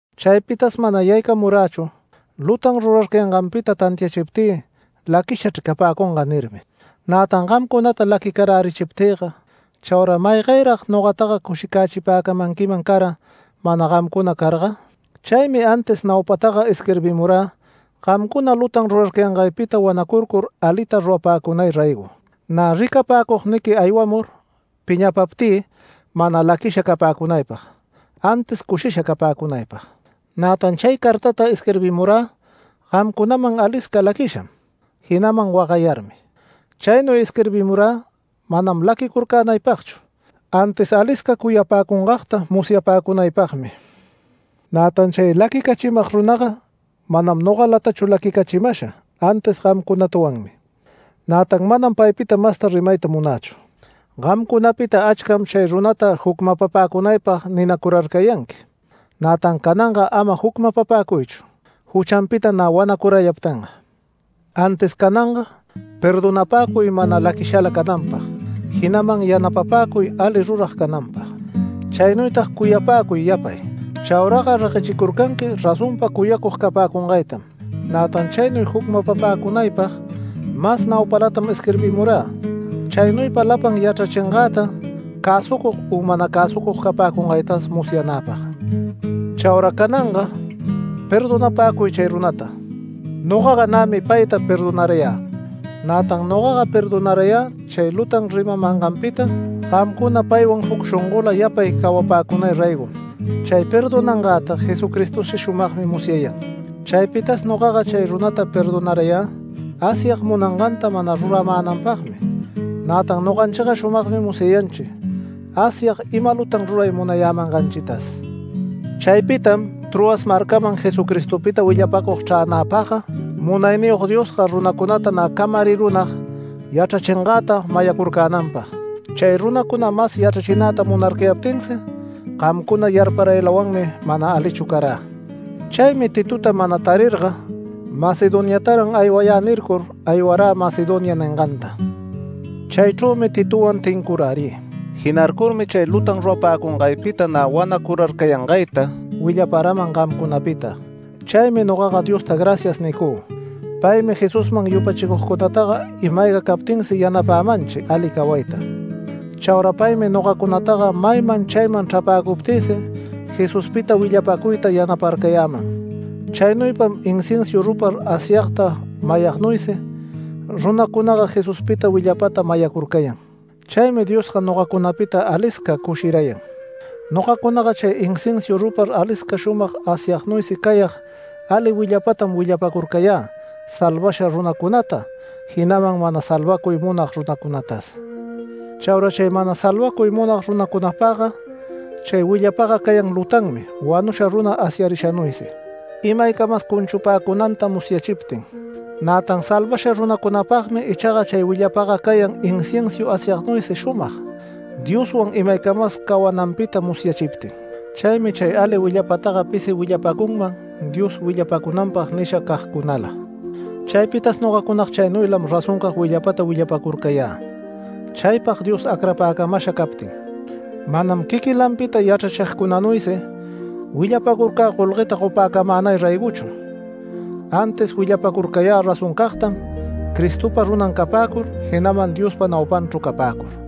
Chaypitas mana yaycamurächu “Lutan rurarcayanganpita tantiachiptï laquishachr capäcunga” nirmi. Nätan gamcunata laquicarärichiptïga chaura ¿maygayrag nogataga cushicachipäcamanquiman cara, mana gamcuna carga? Chaymi antis naupataga isquirbimurä gamcuna lutan rurarcayangaypita wanacurcur alita rurapäcunay raygo. Nä ricapäcugniqui aywamur piñapaptï mana laquisha capäcunaypag, antis cushisha capäcunaypag. Nätan chay cartata isquirbimurä gamcunaman alisca laquisham, jinaman wagayarmi. Chaynuy isquirbimurä manam laquicurcänaypagchu, antis alisca cuyapäcungagta musyapäcunaypagmi. Nätan chay laquicachimag runaga manam nogalatachu laquicachimasha, antis gamcunatawanmi. Nätan manam paypita masta rimayta munächu. Gamcunapita achcam chay runata jucmapapäcunaypag ninacurarcayanqui, nätan cananga ama jucmapapäcuychu juchanpita nä wanacurayaptinga. Antis cananga perdonapäcuy mana laquishala cananpag, jinaman yanapapäcuy ali rurag cananpag. Chaynuytag cuyapäcuy yapay. Chauraga reguechicurcanqui razonpa cuyacug capäcungaytam. Nätan chaynuy jucmapapäcunaypag mas naupalatam isquirbimurä chaynuypa lapan yachrachingäta cäsucug u mana cäsucug capäcungaytas musyanäpag. Chaura cananga perdonapäcuy chay runata. Nogaga nämi payta perdonarayä. Nätan nogaga perdonarayä chay lutan rimamanganpita gamcuna paywan juc shongola yapay cawapäcunay raygom. Chay perdonangäta Jesucristosi shumagmi musyayan. Chaypitas nogaga chay runata perdonarayä Asyag munanganta mana ruramänanpagmi, nätan noganchiga shumagmi musyayanchi Asyag ima lutan ruray munayämanganchitas. Chaypitam Troas marcaman Jesucristopita willapacug chränäpagga, Munayniyog Diosga runacunata nä camarirunag yachrachingäta mayacurcänanpag. Chay runacuna mas yachrachinäta munarcayaptinsi gamcuna yarparaylawanmi mana alichu carä. Chaymi Titota mana tarirga “Macedoniataran aywayä” nircur, aywarä Macedonia ninganta. Chaychrümi Titowan tincurärï. Jinarcurmi chay lutan rurapäcungaypita nä wanacurarcayangayta willaparaman gamcunapita. Chaymi nogaga Diosta “Gracias” nicü. Paymi Jesusman yupachicugcunataga ima-ayga captinsi yanapämanchi ali cawayta. Chaura paymi nogacunataga mayman chayman chrapäcuptïsi Jesuspita willapäcuyta yanaparcayäman. Chaynuypam inciensu rupar asyagta mayagnuysi runacunaga Jesuspita willapata mayacurcayan. Chaymi Diosga nogacunapita alisca cushirayan. Nogacunaga chay inciensu rupar alisca shumag asyagnuysi cayag ali willapatam willapäcurcayä salvasha runacunata, jinaman mana salvacuy munag runacunatas. Chaura chay mana salvacuy munag runacunapagga chay willapaga cayan lutanmi wanusha runa asyarishanuysi, imaycamas cunchupäcunanta musyachiptin. Nätan salvasha runacunapagmi ichaga chay willapaga cayan inciensu asyagnuysi shumag, Dioswan imaycamas cawananpita musyachiptin. Chaymi chay ali willapataga pisi willapacüman Dios willapacunanpag nisha cagcunala. Chaypitas nogacunaga chaynuylam razoncag willapata willapacurcayä. Chaypag Dios acrapäcamasha captin. Manam quiquilanpita yachrachigcunanuysi, willapacurcä golgueta gopäcamänay raygochu, antis willapacurcayä razoncagtam Cristopa runan capäcur, jinaman Diospa naupanchru capäcur.